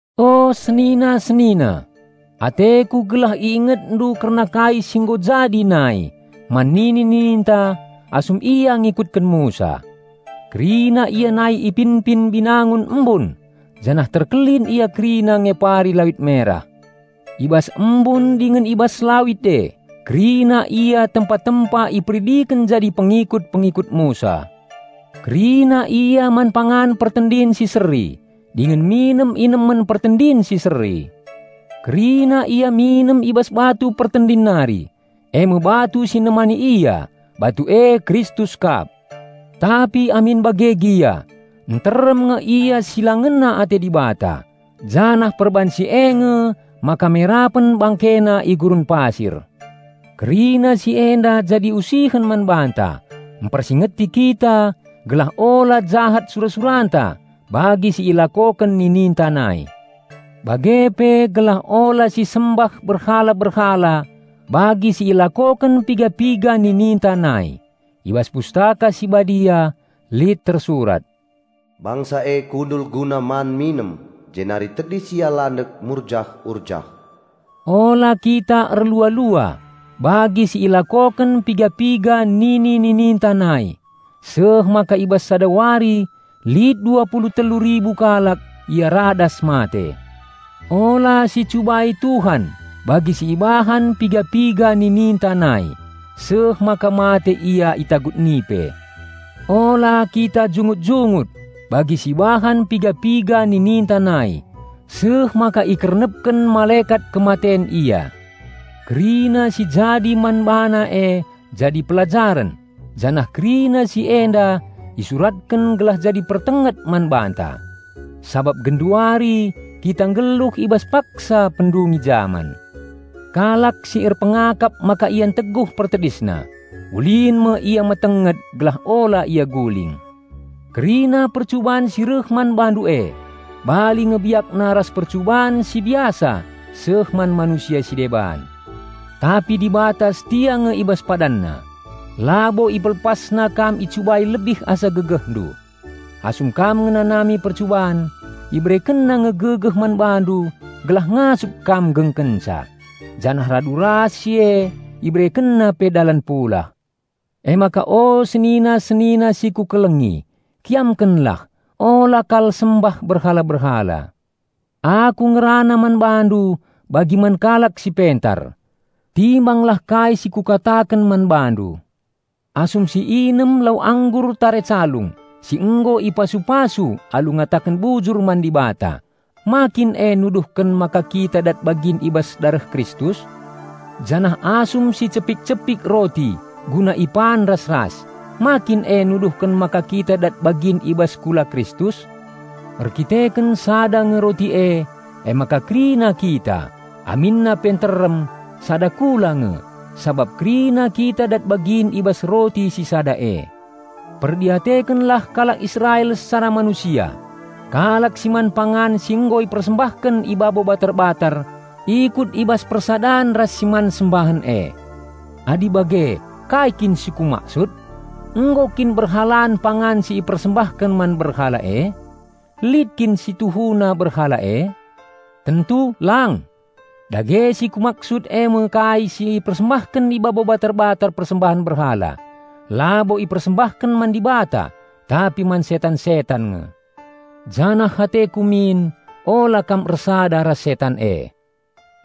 O senina-senina, ateku gelah iingetndu kerna kai si nggo jadi nai man nini-nininta asum ia ngikutken Musa. Kerina ia nai ipinpin binangun embun janah terkelin ia kerina ngepari Lawit Merah. I bas embun dingen i bas lawit e kerina ia tempa-tempa iperidiken jadi pengikut-pengikut Musa. Kerina ia man pangan pertendin si seri, dingen minem inemen pertendin si seri. Kerina ia minem i bas batu pertendin nari, eme batu si nemani ia; batu e Kristus kap. Tapi amin bage gia, nterem nge ia si la ngena ate Dibata, janah perban si e nge maka merapen bangkena i gurun pasir. Kerina si enda jadi usihen man banta, mpersingeti kita gelah ula jahat sura-suranta bagi si ilakoken nininta nai. Bage pe gelah ula sisembah berhala-berhala bagi si ilakoken piga-piga nininta nai. I bas Pustaka Si Badia lit tersurat, "Bangsa e kundul guna man-minem, jenari tedis ia landek murjah-urjah." Ula kita erlua-lua bagi si ilakoken piga-piga nini-nininta nai, seh maka i bas sada wari lit dua pulu telu ribu kalak ia radas mate. Ula sicubai Tuhan bagi si ibahan piga-piga nininta nai, seh maka mate ia itagut nipe. Ula kita jungut-jungut, bagi si ibahan piga-piga nininta nai, seh maka ikernepken Malekat Kematen ia. Kerina si jadi man bana e jadi pelajaren, janah kerina si enda isuratken gelah jadi pertenget man banta. Sabap genduari kita nggeluh i bas paksa pendungi jaman. Kalak si erpengakap maka ia nteguh pertedisna, ulin me ia metenget gelah ula ia guling. Kerina percuban si reh man bandu e bali nge biakna ras percuban si biasa seh man manusia si deban. Tapi Dibata setia nge i bas PadanNa. Labo IpelepasNa kam icubai lebih asa gegehndu. Asum kam ngenanami percuban, IberekenNa nge gegeh man bandu gelah ngasup kam nggengkenca, janah radu ras si e IberekenNa pe dalan pulah. Emaka o senina-senina si kukelengi, kiamkenlah, ula kal sembah berhala-berhala. Aku ngerana man bandu bagi man kalak si pentar. Timbanglah kai si kukataken man bandu. Asum siinem lau anggur tare calung si nggo ipasu-pasu alu ngataken bujur man Dibata, ma kin e nuduhken maka kita dat bagin i bas dareh Kristus? Janah asum sicepik-cepik roti guna ipan ras-ras, ma kin e nuduhken maka kita dat bagin i bas kula Kristus? Erdandanken sada nge roti e, emaka kerina kita, aminna pe nterem, sada kula nge, sabap kerina kita dat bagin i bas roti si sada e. Perdiatekenlah kalak Israel secara manusia; kalak si man pangan si nggo ipersembahken i babo batar-batar ikut i bas persadan ras si man sembahen e. Adi bage, kai kin si kumaksud? Nggo kin berhalan pangan si ipersembahken man berhala e? Lit kin si tuhuna berhala e? Tentu lang! Dage si kumaksud eme kai si ipersembahken i babo batar-batar persembahen berhala, labo ipersembahken man Dibata, tapi man setan-setan nge. Janah ateku min ula kam ersada ras setan e.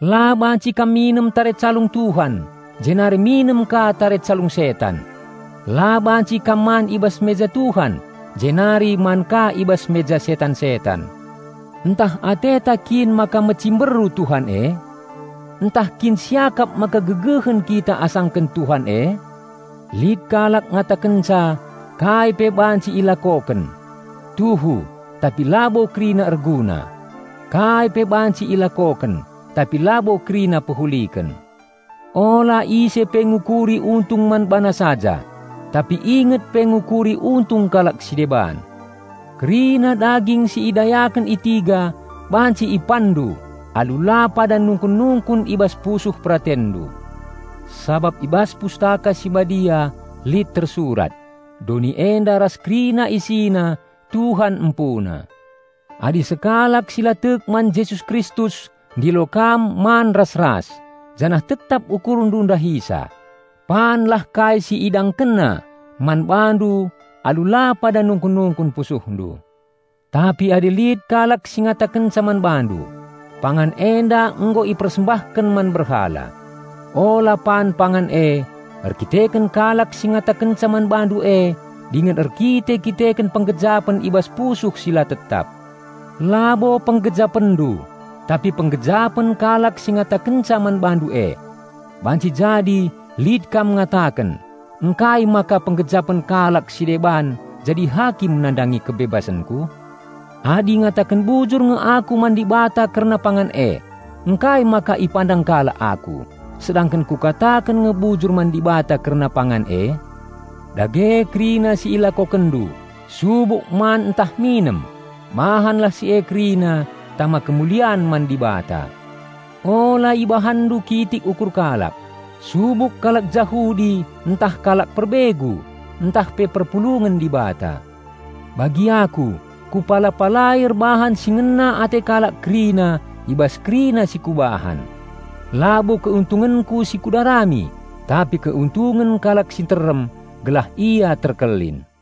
La banci kam minem tare calung Tuhan jenari minem ka tare calung setan. La banci kam man i bas meja Tuhan jenari man ka i bas meja setan-setan. Ntah ateta kin maka mecimberu Tuhan e? Ntah kin siakap maka gegehen kita asangken Tuhan e? Lit kalak ngatakenca, "Kai pe banci ilakoken." Tuhu, tapi labo kerina erguna. "Kai pe banci ilakoken," tapi labo kerina pehuliken. Ula ise pe ngukuri untung man bana saja, tapi inget pe ngukuri untung kalak si deban. Kerina daging si idayaken i tiga banci ipanndu alu la pada nungkun-nungkun i bas pusuh peratenndu. Sabap i bas Pustaka Si Badia lit tersurat, "Doni enda ras kerina isina Tuhan empuna." Adi sekalak si la tek man Jesus Kristus ndilo kam man ras-ras, janah tetap ukurndu ndahisa, panlah kai si idangkenna man bandu alu la pada nungkun-nungkun pusuhndu. Tapi adi lit kalak si ngatakenca man bandu, "Pangan enda nggo ipersembahken man berhala," ula pan pangan e erkiteken kalak si ngatakenca man bandu e dingen erkite-kiteken penggejapen i bas pusuh si la tetap. -- Labo penggejapenndu, tapi penggejapen kalak si ngatakenca man bandu e. Banci jadi lit kam ngataken, "Ngkai maka penggejapen kalak si deban jadi hakim nandangi kebebasenku? Adi ngataken bujur nge aku man Dibata kerna pangan e, ngkai maka ipandang kalak aku, sedangken kukataken nge bujur man Dibata kerna pangan e?" Dage kerina si ilakokenndu, subuk pangan ntah inemen, bahanlah si e kerina tama kemulian man Dibata. Ula ibahanndu kitik ukur kalak, subuk kalak Jahudi ntah kalak perbegu ntah pe perpulungen Dibata. Bagi aku, kupala-palai erbahan si ngena ate kalak kerina i bas kerina si kubahan. Labo keuntungenku si kudarami, tapi keuntungen kalak si nterem, gelah ia terkelin.